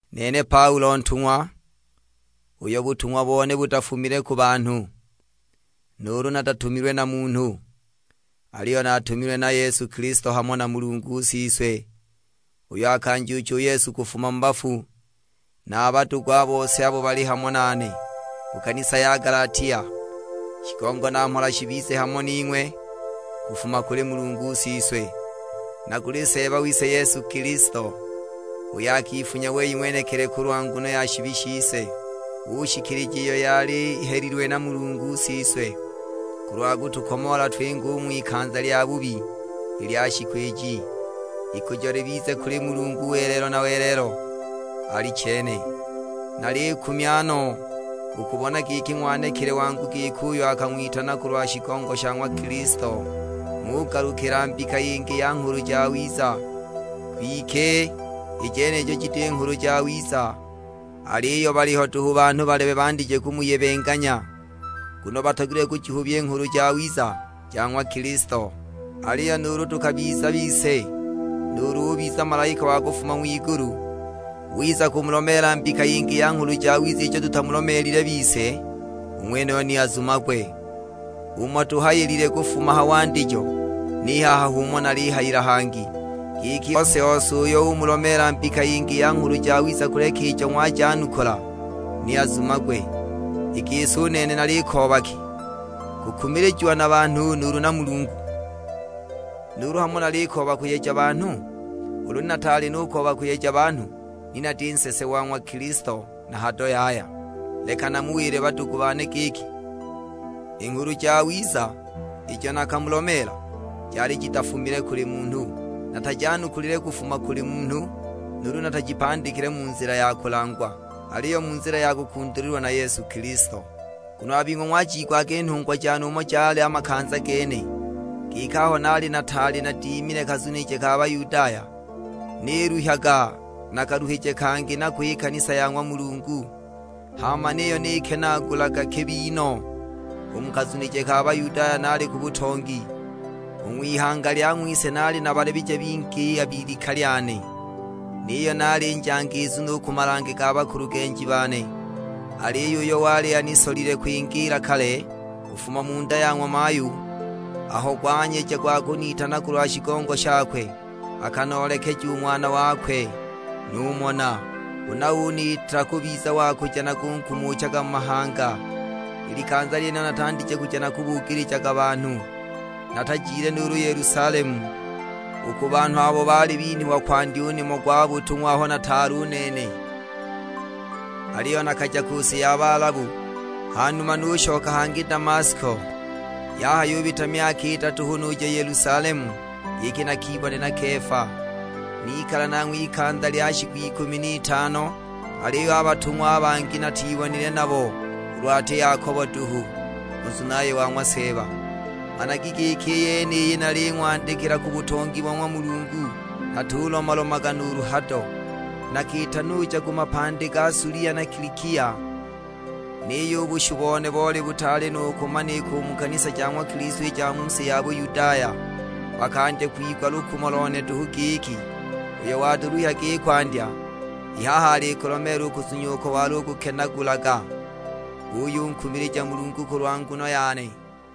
Nene Paulo ntung'wa, uyo butung'wa bone butafumile ku banhu, nuulu natatumilwe na munhu. Aliyo natumilwe na Yesu Kilisto hamo na Mulungu Siswe, uyo akanjuucha u Yesu kufuma mu bafu; na a badugu a bose abo bali hamo nane: Ku kanisa ja Galatia. Shigongo na mhola shibize hamo ning'we kufuma kuli Mulungu Siswe, na kuli Seeba wise Yesu Kilisto; uyo akifunya wei ng'wenekili kulwa nguno ya shibi shise, ushikilija iyo yali ihelilwe na Mulungu Siswe, kulwa kutukomoola twinge u ng'wikanza lya bubi i lya shiku iji. Ikujo libize kuli Mulungu welelo na welelo: Alichene. Nalikumya no u kubona giki ng'wanekile wangu giko uyo akang'witana kulwa shigongo sha ng'wa Kilisto, ng'ugalukila mbika yingi ya nghulu jawiza. Kwike i jenijo jiti Nghulu Jawiza; aliyo baliho duhu banhu balebe bandije kumuyebenganya, nguno batogilwe kujihubya i Nghulu Jawiza ja ng'wa Kilisto! Aliyo nuulu tukabiza bise, nuulu ubiza malaika wa kufuma ng'wigulu wiza kumulomeela mbika yingi ya nghulu jawiza ijo tutamulomeelile bise, u ng'wenuyo ni azumagwe! Umo tuhayilile kufuma ha wandijo, ni haha h'umo nalihayila hangi; giki, ose-ose uyo umulomeela mbika yingi ya nghulu jawiza kuleka ijo ng'wajanukula, ni azumagwe! I gisi u nene nalikooba ki, kukumilijiwa na banhu, nuulu na Mulungu? Nuulu hamo nalikooba kuyeja banhu? Ulu ni nataali nukooba kuyeja banhu ni nati nsese wa ng'wa Kilisto na hado yaya! Leki namuwile badugu bane giki, i Nghulu Jawiza ijo nakamulomeela, jali jitafumile kuli munhu. Natajanukulile kufuma kuli munhu, nuulu natajipandikile mu nzila ya kulangwa; aliyo mu nzila ya kukundulilwa na Yesu Kilisto. Nguno a bing'we ng'wajiigwaga i nhungwa jane umo jali a makanza gene, giki aho naali nataali nadimile a kazunije ka Bayudaya, niluhyaga na kaluhije kangi nako i kanisa ya ng'wa Mulungu, hama niyo nikenaagulaga kibi no! U mu kazunije ka Bayudaya naali ku butongi; u ng'wihanga lya ng'wise naali nabalebije bingi a b'ilika lyane, niyo naali njangiizu no u ku malange ga bakulugenji bane! Aliyo uyo wali anisolile kwingiila kale, kufuma mu nda ya ng'wa mayu, aho gwanyeja gwa kunitana kulwa shigongo shakwe, akanoolekeja u Ng'wana wakwe; numona. Huna uniita kubiza wa kuja nakunkumuchaga mu mahanga. I likanza lyenilo natandije kuja nakubugilija banhu. Natajile nuulu Yelusalemu, u ku banhu abo baali binhwa kwandya u nimo gwa butung'wa aho nataali u nene, aliyo nakaja ku si ya Balabu, hanuma nushoka hangi Damasko. Yahayubita myaka idatu hu nuja i Yelusalemu giki nakibone na Kefa; nikala nanghwe ikanza lya shiku ikumi n'itano. Aliyo a batung'wa a bangi natibonile nabo, ulu ati Yakobo duhu, u nzunaye wa ng'wa Seeba. Managi giki i yeniyi naling'wandikila ku butongi bo ng'wa Mulungu, natulomalomaga nuulu hado! Nakiita nuja ku mapandi ga Sulia na Kilikia. Niyo u bushu bone boli butaali nu kumanika u mu kanisa ja ng'wa Kilisto i ja mu si ya Buyudaya. Bakandya kwigwa lukumo lone duhu giki, "Uyo walutuluhyaga i kwandya, i haha alikulomeela u kuzunya uko walukukenaagulaga". Buyunkumilija Mulungu kulwa nguno yane.